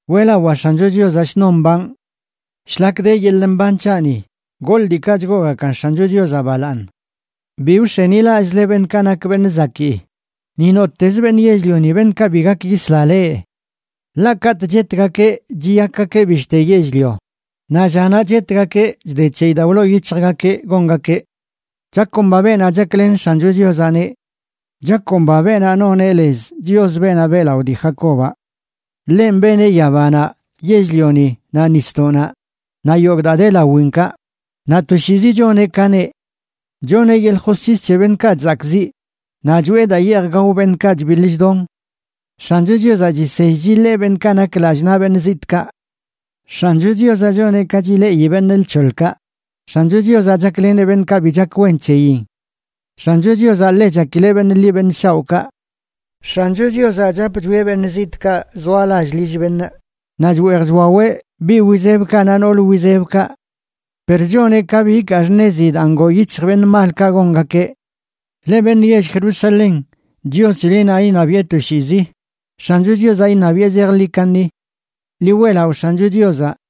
Weꞌlawaa X̱ancho Chiozaꞌ shnon mbanꞌ. Shlak de yeḻꞌ mban c̱haꞌni goḻꞌ diikaꞌ chgoogakan X̱ancho Chiozaꞌ balaaṉ. Bi wx̱enilallꞌzle beṉꞌkaꞌ nak beṉꞌ zakii, ni nottez beṉꞌ yell-lioni, beṉꞌkaꞌ bi gak yisla leꞌ. Ḻaꞌ katꞌ chetgakeꞌ chiyakgakeꞌ bishte yell-lio, naꞌ llanaꞌ chetgakeꞌ chde c̱heyi daa wloo yic̱hjgakeꞌ gongakeꞌ. Chakomba beenaꞌ chaklen X̱ancho Chiozaꞌneꞌ. Chakomba beenaꞌ noneꞌ lez Chios, beenaꞌ beꞌlaꞌo dii Jacobaꞌ. Ḻenꞌ beneꞌ yabanaꞌ, yell-lioni naꞌ nisdoꞌnaꞌ, naꞌ yogꞌ daa de lawinkaꞌ, naꞌ toshiizi choneꞌ ka neꞌ. Choneꞌ yeḻꞌ josc̱his c̱he beṉꞌkaꞌ chzakꞌziꞌ, naꞌ choꞌe daa yeej gao beṉꞌkaꞌ chbiḻ chdon. X̱ancho Chiozaꞌ chisell chiḻee beṉꞌkaꞌ nak lallꞌ naꞌ beṉꞌ zitꞌkaꞌ. X̱ancho Chiozaꞌ choneꞌ ka chileꞌi beṉꞌ lc̱hoḻkaꞌ. X̱ancho Chiozaꞌ chakleneꞌ beṉꞌkaꞌ bi chak wen c̱heyin. X̱ancho Chiozaꞌ ḻe chakileꞌ beṉꞌ ḻi beṉꞌ shaoꞌkaꞌ. X̱ancho Chiozaꞌ chap chwieꞌ beṉꞌ zitꞌkaꞌ zoa lall lill beṉꞌ, naꞌ chweej chwaweꞌ biꞌ wizebkaꞌ naꞌ nool wizebkaꞌ. Per choneꞌ ka bi ikaa xṉezi daa ngoo yic̱hj beṉꞌ malkaꞌ gongakeꞌ. Leꞌ beṉꞌ yell Jerusalén, Chios c̱helenaꞌ iṉabiꞌe toshiizi. X̱ancho Chiozaꞌ, iṉabiꞌe zejḻi kaṉi. ¡Ḻi weꞌlaꞌo X̱ancho Chiozaꞌ!